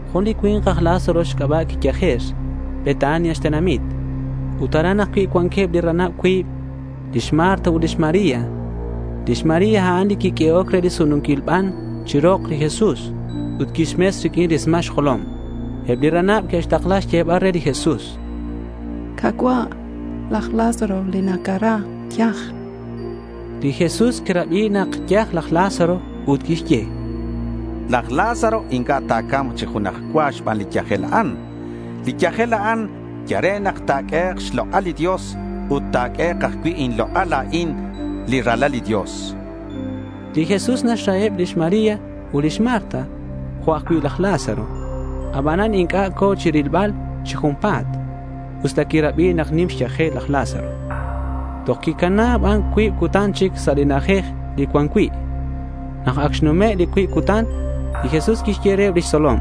Jun li cui̱nk aj Lázaro xc'aba' quiyajer. Betania xtenamit. Ut aran ajcui' cuanqueb li ranab cuib, lix Marta ut lix María. (Lix María, a'an li quiq'uehoc re li sununquil ban chiru rok li Jesús ut quixmes riq'uin rismal xjolom.) Eb li ranab que'xtakla xyebal re li Jesús: —Ka̱cua', laj Lázaro li nacara yaj. Li Jesús quirabi nak yaj laj Lázaro, ut quixye: —Laj Lázaro inc'a' ta̱ca̱mk chi junaj cua xban li yajel a'an. Li yajel a'an yal re nak ta̱q'uehek' xlok'al li Dios ut ta̱q'uehek' ajcui' inlok'al la̱in li Ralal li Dios, chan. Li Jesús naxraheb lix María ut lix Marta jo' ajcui' laj Lázaro. Abanan inc'a' co̱ chirilbal chi junpa̱t, usta quirabi nak nim xyajel laj Lázaro. Toj quicana ban cuib cutan chic sa' li na'ajej li cuan cui'. Nak ac xnume' li cuib cutan, li Jesús quixye reheb lix tzolom: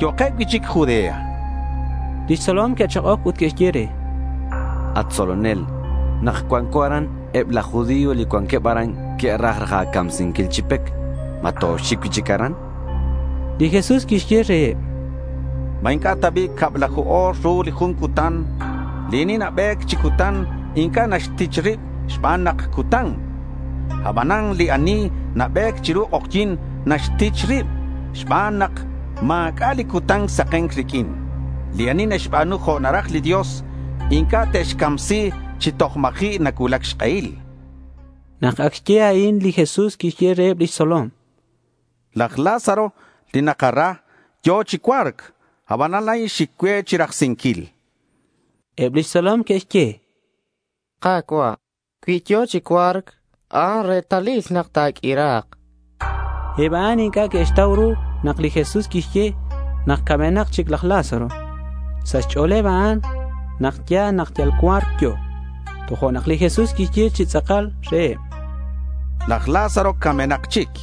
—Yo'keb cui'chic Judea, chan. Lix tzolom que'chak'oc ut que'xye: —At tzolonel, nak cuanco aran, eb laj judío li cuanqueb aran que'raj raj a̱camsinquil chi pec. ¿Ma toxic cui'chic aran? chanqueb. Li Jesús quixye reheb: —¿Ma inc'a' ta bi' cablaju o̱r ru li jun cutan? Li ani nabe̱c chi cutan inc'a' naxtich rib xban nak cutan. Abanan li ani nabe̱c chiru k'ojyi̱n, naxtich rib xban nak ma̱c'a' li cutan saken riq'uin. Li ani naxba̱nu jo' naraj li Dios inc'a' te'xcamsi chi toj ma̱ji' nacuulac xk'ehil. Nak ac xye a'in, li Jesús quixye reheb lix tzolom: —Laj Lázaro li nakara, yo̱ chi cua̱rc. Abanan la̱in xic cue chirajsinquil, chan. Eb lix tzolom que'xye: —Ka̱cua', cui yo̱ chi cua̱rc, a'an retalil nak ta̱q'uira̱k, chanqueb. Eb a'an inc'a' que'xtau ru nak li Jesús quixye nak camenak chic laj Lázaro. Sa' xch'o̱leb a'an nak ya̱l nak yal cua̱rc yo̱. Tojo'nak li Jesús quixye chi tz'akal reheb: —Laj Lázaro camenak chic.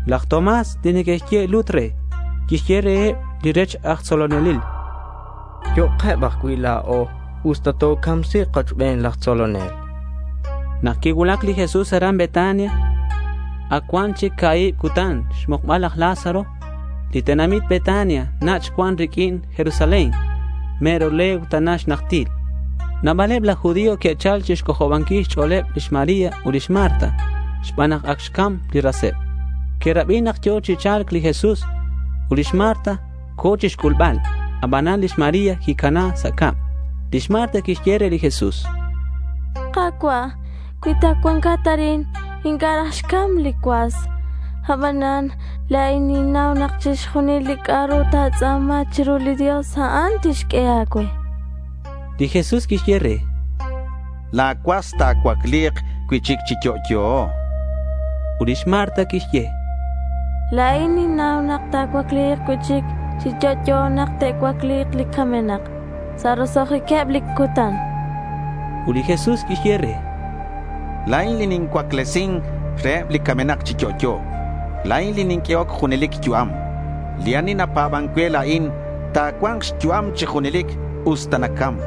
Laj Tomás, li neque'xye lut re, quixye reheb li rech aj tzolonelil: —Yo'keb ajcui' la̱o usta tocamsi̱k kochben laj tzolonel, chan. Nak quicuulac li Jesús aran Betania, ac cuan chic ca̱hib cutan xmukbal laj Lázaro. Li tenamit Betania nach' cuan riq'uin Jerusalén, mero legua tana xnajtil. Nabaleb laj judío que'chal chixc'ojobanquil xch'o̱leb lix María ut lix Marta xban nak ac xcam li raseb. Que'rabi nak yo̱ chi cha̱lc li Jesús, ut lix Marta co̱ chixc'ulbal. Abanan lix María quicana sa' cab. Lix Marta quixye re li Jesús: —Ka̱cua', cui ta cuancat arin, inc'a' raj xcam li cuas. Abanan la̱in ninnau nak chixjunil li c'a'ru ta̱tz'a̱ma chiru li Dios, a'an tixq'ue a̱cue, chan lix Marta. Li Jesús quixye re: —La̱ cuas ta̱cuacli̱k cui'chic chi yo'yo, chan. Ut lix Marta quixye: —La̱in ninnau nak ta̱cuacli̱k cui'chic chi yo'yo nak te'cuacli̱k li camenak sa' roso'jiqueb li cutan, chan. Ut li Jesús quixye re: —La̱in li nincuaclesin reheb li camenak chi yo'yo. La̱in li ninq'uehoc junelic yu'am. Li ani napa̱ban cue la̱in ta̱cua̱nk xyu'am chi junelic usta nacam.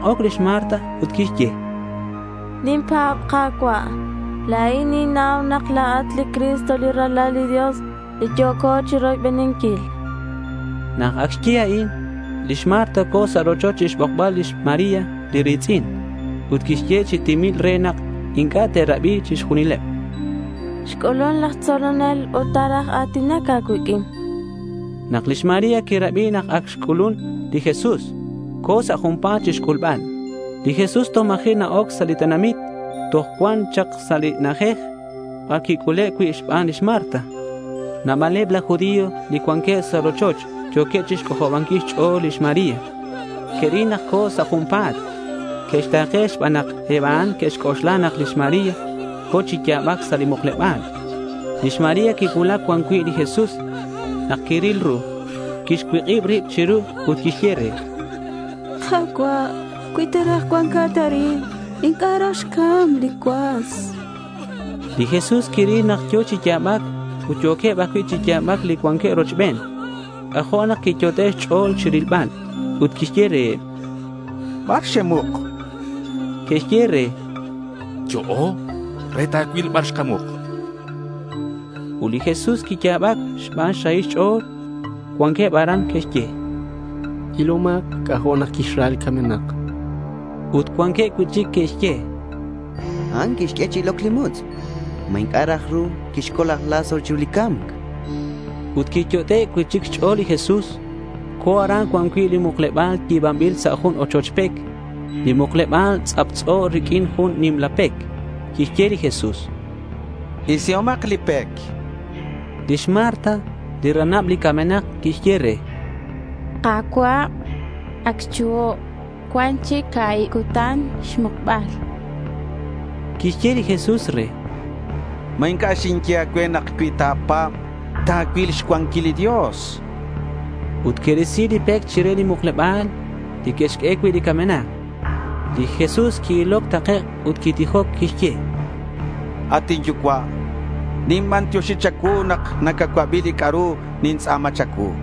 Quichak'oc lix Marta ut quixye: —Ninpa̱b, Ka̱cua'. La̱in ninnau nak la̱at li Cristo li Ralal li Dios li yo̱co chiroybeninquil, chan lix Marta. Nak ac xye a'in, lix Marta co̱ sa' rochoch chixbokbal lix María li ri̱tz'in. Ut quixye re chi timil re nak inc'a' te'rabi chixjunileb: —Xc'ulun laj tzolonel ut ta̱raj a̱tinac a̱cuiq'uin, chan re. Nak lix María quirabi nak ac xc'ulun li Jesús, co̱ sa' junpa̱t chixc'ulbal. Li Jesús toj ma̱ji' na-oc sa' li tenamit. Toj cuan chak sa' li na'ajej bar quic'ule' cui' xban lix Marta. Nabaleb laj judío li cuanqueb sa' li rochoch yo̱queb chixc'ojobanquil xch'o̱l lix María. Que'ril nak co̱ sa' junpa̱t. Que'xta̱ke xban nak eb a'an que'xc'oxla nak lix María co̱ chi ya̱bac sa' li mukleba̱l. Lix María quicuulac cuan cui' li Jesús. Nak quiril ru, quixcuik'ib rib chiru ut quixye re: —Ka̱cua', cui ta cuancat arin, inc'a' raj xcam li cuas, chan re. Li Jesús quiril nak yo̱ chi ya̱bac ut yo̱queb ajcui' chi ya̱bac li cuanqueb rochben. C'ajo' nak quiyot'e' xch'o̱l chi rilbal. Ut quixye reheb: —¿Bar xemuk?— Que'xye re: —Yo'o re ta̱cuil bar xkamuk, chanqueb. Ut li Jesús quiya̱bac xban xrahil xch'o̱l. Cuanqueb aran que'xye: —Ilomak c'ajo' nak quixra li camenak, chanqueb. Ut cuanqueb cui'chic li que'xye: —A'an quixq'ue chi iloc li mutz'. ¿Ma inc'a' raj xru quixcol laj Lázaro chiru li ca̱mc? chanqueb. Ut quiyot'e' cui'chic xch'o̱l li Jesús. Co̱ aran cuan cui' li mukleba̱l yi̱banbil sa' jun ochoch pec. Li mukleba̱l tz'aptz'o riq'uin jun nimla pec. Quixye li Jesús: —Isihomak li pec.— Lix Marta, li ranab li camenak quixye re: —Ka̱cua', ac xchuho'. Cuan chic ca̱hib cutan xmukbal, chan. Quixye li Jesús re: —¿Ma inc'a' xinye a̱cue nak cui ta̱pa̱b, ta̱cuil xcuanquilal li Dios? chan. Ut que'risi li pec chire li mukleba̱l li que'xq'ue cui' li camenak. Li Jesús qui-iloc takec' ut quitijoc. Quixye: —At inYucua', ninbantioxi cha̱cuu nak nacacuabi li c'a'ru nintz'a̱ma cha̱cuu.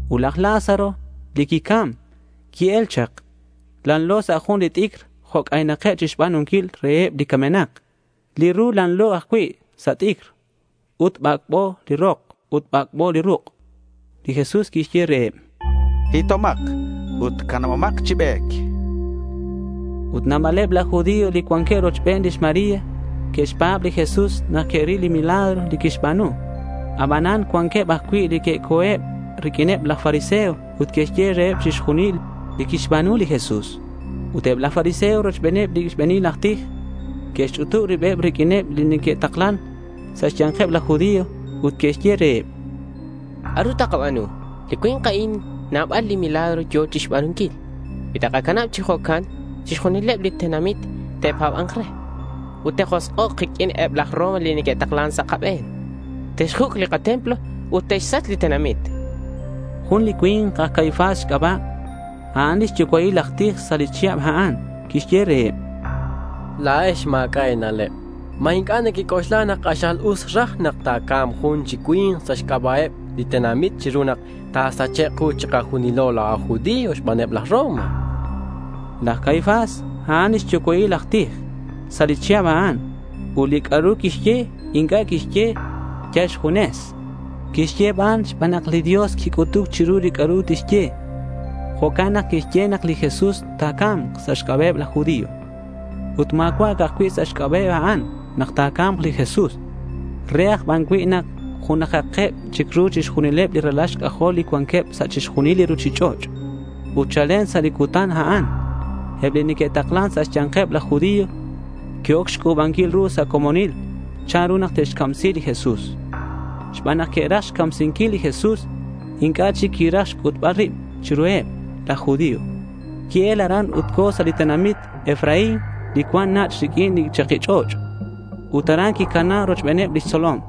Ut laj Lázaro li quicam qui-el chak. Lanlo sa' jun t'icr jo' c'aynakeb chixba̱nunquil reheb li camenak. Li ru lanlo ajcui' sa' t'icr ut bac'bo li rok ut bac'bo li ruk'. Li Jesús quixye reheb: —Hitomak ut canabomak chi be̱c, chan. Ut nabaleb laj judío li cuanqueb rochben lix María que'xpa̱b li Jesús nak que'ril li milagro li quixba̱nu. Abanan cuanqueb ajcui' li que'co̱eb riq'uineb laj fariseo ut que'xye reheb chixjunil li quixba̱nu li Jesús. Ut eb laj fariseo rochbeneb li xbe̱nil aj tij que'xch'utub ribeb riq'uineb li neque'taklan sa' xya̱nkeb laj judío ut que'xye reheb: —¿C'a'ru takaba̱nu? Li cui̱nk a'in nabal li milagro yo̱ chixba̱nunquil. Cui takacanab chi jo'can, chixjunileb li tenamit te'pa̱ba̱nk re. Ut te'josk'ok kiq'uin eb laj Roma li neque'taklan sa' kabe̱n. Te'xjuc' li katemplo ut te'xsach li katenamit, chanqueb. Jun li cui̱nk aj Caifás xc'aba', a'an li xyucua'il aj tij sa' li chihab a'an. Quixye reheb: —La̱ex ma̱c'a' e̱na'leb. ¿Ma inc'a' nequec'oxla nak k'axal us raj nak ta̱ca̱mk jun chi cui̱nk sa' xc'aba'eb li tenamit chiru nak ta̱sachek' ku chikajunilo la̱o aj judío xbaneb laj Roma? chan. Laj Caifás, a'an li xyucua'il aj tij sa' li chihab a'an. Ut li c'a'ru quixye inc'a' quixye yal xjunes. Quixye ban xban nak li Dios quic'utuc chiru li c'a'ru tixye. Jo'can nak quixye nak li Jesús ta̱ca̱mk sa' xc'aba'eb laj judío. Ut ma̱cua' ca'aj cui' sa' xc'aba'eb a'an nak ta̱ca̱mk li Jesús. Re aj ban cui' nak junajakeb chic ru chixjunileb li ralal xc'ajol li cuanqueb sa' chixjunil li ruchich'och'. Ut chalen sa' li cutan a'an, eb li neque'taklan sa' xya̱nkeb laj judío que'oc xc'u̱banquil ru sa' comonil chanru nak te'xcamsi li Jesús. Xban nak que'raj xcamsinquil li Jesús, inc'a' chic quiraj xc'utbal rib chiruheb laj judío. Qui-el aran ut co̱ sa' li tenamit Efraín li cuan nach' riq'uin li chaki ch'och'. Ut aran quicana rochbeneb lix tzolom.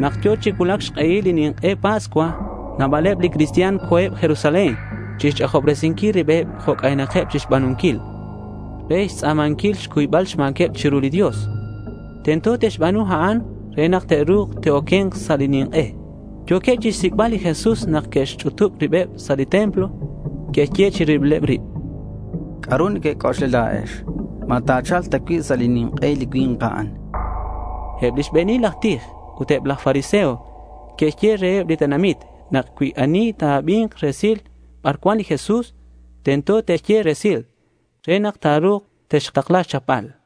Nak yo̱ chi cuulac xk'ehil li nink'e Pascua, nabaleb li cristian co̱eb Jerusalén chixch'ajobresinquil ribeb jo' c'aynakeb chixba̱nunquil re xtz'a̱manquil xcuybal xma̱queb chiru li Dios. Tento te'xba̱nu a'an re nak ta̱ru̱k te'oque̱nk sa' li nink'e. Yo̱queb chixsic'bal li Jesús nak que'xch'utub ribeb sa' li templo. Que'xye chi ribileb rib: —¿C'a'ru nequec'oxla la̱ex? ¿Ma ta̱cha̱lk ta cui' sa' li nink'e li cui̱nk a'an?— Eb li xbe̱nil aj tij ut eb laj fariseo que'xye reheb li tenamit nak cui ani ta̱abi̱nk resil bar cuan li Jesús, tento te'xye resil, re nak ta̱ru̱k te'xtakla xchapbal.